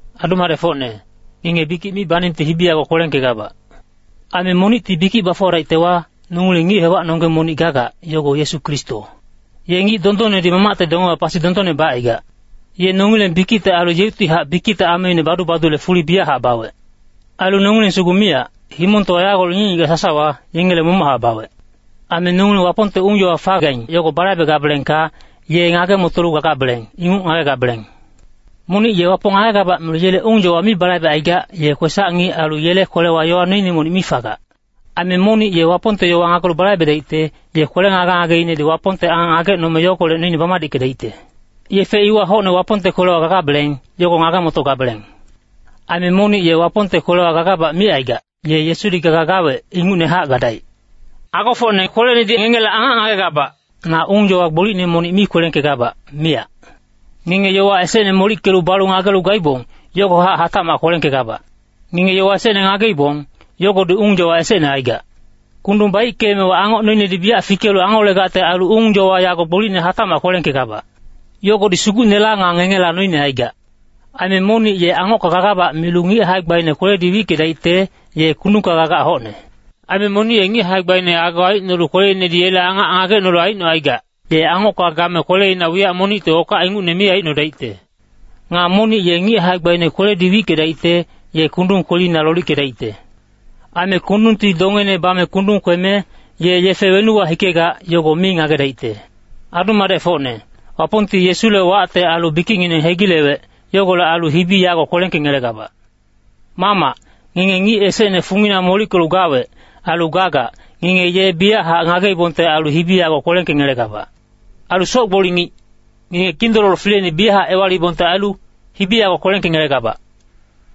Adu-madecfocne, ngenge bikic mi baningte hibi yago kwelengkegabac. Aime monicti bikic bafuwadaictewa, nongileng ngic-hewacnonggeng monic gagac, yogo Yesu Kristo. Ye ngic dondonnedi Mamacte dongewa pasi dondonne bacaigac. Ye nongileng bikicte ailu yeuctihac bikicte ameine badu-badule fuli biyachac bawec. Ailu nongileng sugu miyac, himongtowa yagolec ngic-ngigac sasawa, yengele momochac bawec. Aime nongileng Wapongte ung-yowa fagaing yogo balaibegabelengka, ye ngage-motolu gagabeleng, inguc ngagegabeleng. Monic ye Wapong ngagegabac milu yele ung-yowa mi balaibecaigac, ye kwesac-ngic ailu yele kwelewa yowa noine monic mi fagac. Aime monic ye Wapongte yowa ngagelu balaibedaicte, ye kwele ngage-ngageinedi Wapongte angac ngagecnome yogolec noine bamadickedaicte. Yefe iwa hocne Wapongte kwelewa gagabeleng, yogo ngage-motogabeleng. Aime monic ye Wapongte kwelewa gagabac micaigac, ye Yesudi gaga gawec, ingucnehac gadaic. Agofocne kwelenedi ngengele angac ngagegabac, na ung-yowa gbolicne monic mi kwelengkegabac, miyac. Ngenge yowa esecne molickelu balu ngagelu gaibong, yogohac hatacmac kwelengkegabac. Ngenge yowa esecne ngageibong, yogodi ung-yowa esecne aigac. Kundung baickeemewa angoc noinedi biyac fikelu angolegacte ailu ung-yowa yago gbolicne hatacmac kwelengkegabac. Yogodi Sugucnela nga ngengela noine aigac. Aime monic ye angocka gagabac milu ngic hae-gbaine kweledi wickedaicte, ye kundungka gagac hocne. Aime monic ye ngic hae-gbaine ago aicnolu kweleinedi yele angac ngagecnolu aicnocaigac, ye angocka game kweleina wiyac monicti okac ingucne mi aicnodaicte. Nga monic ye ngic hae-gbaine kweledi wickedaicte, ye kundung kwelina lolickedaicte. Aime kundungti dongeine bame kundung kweme, ye yefe wenuwa hikegac, yogo mi ngagedaicte. Adu-madecfocne, Wapongti Yesule wacte ailu bikicngineng hegilewec. Yogolec ailu hibi yago kwelengkengelegabac. Mamac, ngenge ngic esecne fungina molickelu gawec, ailu gagac, ngenge ye biyachac ngageibongte ailu hibi yago kwelengkengelegabac. Ailu soc-gboli ngic, ngenge Kindololo fileine biyachac ewaliibongte ailu, hibi yago kwelengkengelegabac.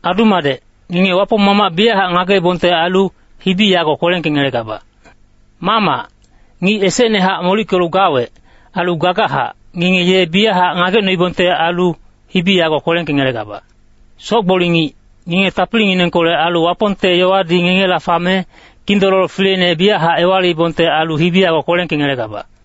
Adu-madec, ngenge Wapong Mamac biyachac ngagecnoibongte ailu, hibi yago kwelengkengelebac. Mamac, ngic esecnahac molickelu gawec, ailu gagachac, ngenge ye biyachac ngagecnoibongte ailu, hibi yago kwelengkengelebac. Soc-gboli ngic, ngenge tapilinginengkolec ailu Wapongte yowadi ngengela fame, Kindololo fileine biyachac ewaliibongte ailu hibi yago kwelengkengelebac.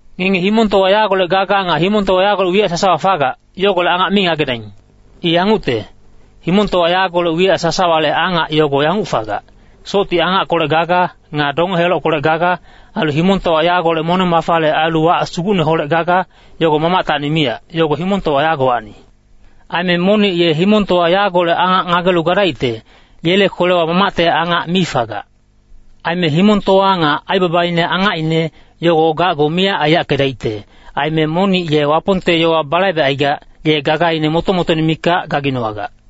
Ngenge himongtowa yagolec gaga nga himongtowa yagolec wiyac sasawa fagac, yogolec angac mi ngagedaing. I yangucte, himongtowa yagolec wiyac sasawale angac yogo yanguc fagac. Socti angackolec gaga, nga donge-helockolec gaga, ailu himongtowa yagolec moneng-mafale ailu wac sugucneholec gaga, yogo Mamactacni miyac. Yogo himongtowa yagowacni. Aime monic ye himongtowa yagolec angac ngagelu gadaicte, yele kwelewa Mamacte angac mi fagac. Aime himongtowa nga aibabaine angacine, yogo gacgu miyac aiyackedaicte. Aime monic ye Wapongte yowa balaibecaigac, ye gagaine moto-motoine mikac gaginowagac.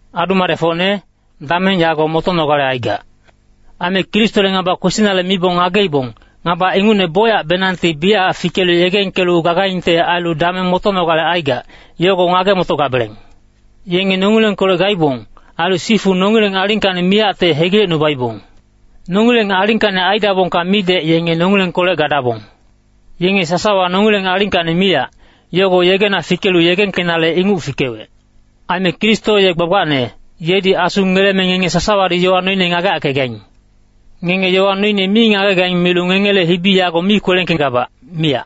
Adu-madecfocne, dameng yago motonogale aigac. Aime Kristole ngaba kwesinale mibong ngageibong, ngaba ingucne bocyacbenangti biyachac fikelu yegengkelu gagaingte ailu dameng motonogale aigac, yogo ngage-motogabeleng. Yenge nongilengkolec gaibong. Ailu sifu nongileng alingkacni miyacte hegilecnubaibong. Nongileng alingkacni aidabongka midec yenge nongilengkolec gadabong. Yenge sasawa nongileng alingkacni miyac, yogo yegena fikelu yegengkenale, inguc fikewec. Aime Kristo ye gbagbacne, yedi Asu ngeleme ngenge sasawadi yowa noine ngageyackegaing. Ngenge yowa noine mi ngagegaing milu ngengele hibi yago mi kwelengkegabac, miyac.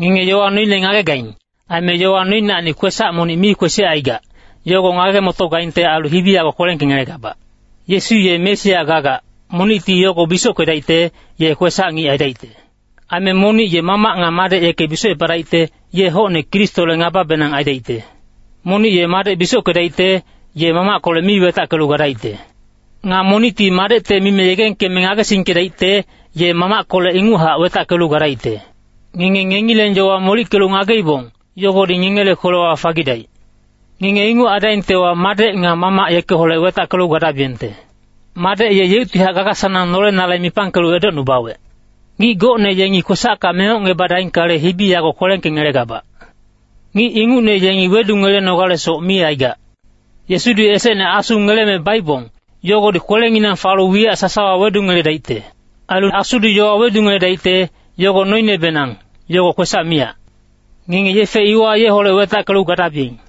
Ngenge yowa noine ngagegaing. Aime yowa noinacni kwesac monic mi kwesicaigac, yogo ngage-motogaingte ailu hibi yago kwelengkengelegabac. Yesu ye Mesia gagac, monicti yogo bisockedaicte, ye kwesac-ngic aidaicte. Aime monic ye Mamac nga Madec yeke bisocepadaicte, ye hocne Kristole ngababenang aidaicte. Monic ye Madec bisockedaicte, ye Mamackolec mi wetackelu gadaicte. Nga monicti Madecte mime yegengkeme ngagesingkedaicte, ye Mamackolec inguchac wetackelu gadaicte. Ngenge ngengileng yowa molickelu ngageibong, yogodi ngengele kwelewa fagidaic. Ngenge inguc aidaingtewa, Madec nga Mamac yekeholec wetackelu gadabiyengte. Madec ye yeuctihac gaga-sanang nolenale mipangkelu edocnubawec. Ngic gocne yengi kwesacka mengocngebadaingkale, hibi yago kwelengkengelegabac. Ngic ingucne yengi wedungelenogalesoc mi aigac. Yesudi esecne Asu ngeleme baibong, yogodi kwelenginang falu wiyac sasawa wedungeledaicte. Ailu Asudi yowa wedungeledaicte, yogo noinebenang, yogo kwesac miyac. Ngenge yefe iwa yeholec wetackelu gadabiyeng.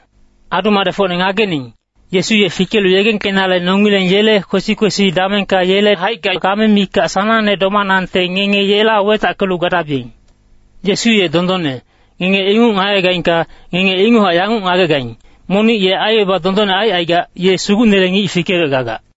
Adu-madecfocne ngagening, Yesu ye fikelu yegengkenale nongileng yele kwesi-kwesi damengka yele haicka game mikac sanangne domanangte ngenge yeholec wetackelu gadabiyeng. Yesu ye dondonne, ngenge inguc ngagegaingka, ngenge inguchac yanguc ngagegaing, monic ye aibaba dondonne aicaigac, ye Sugucnele ngic fikewec gagac.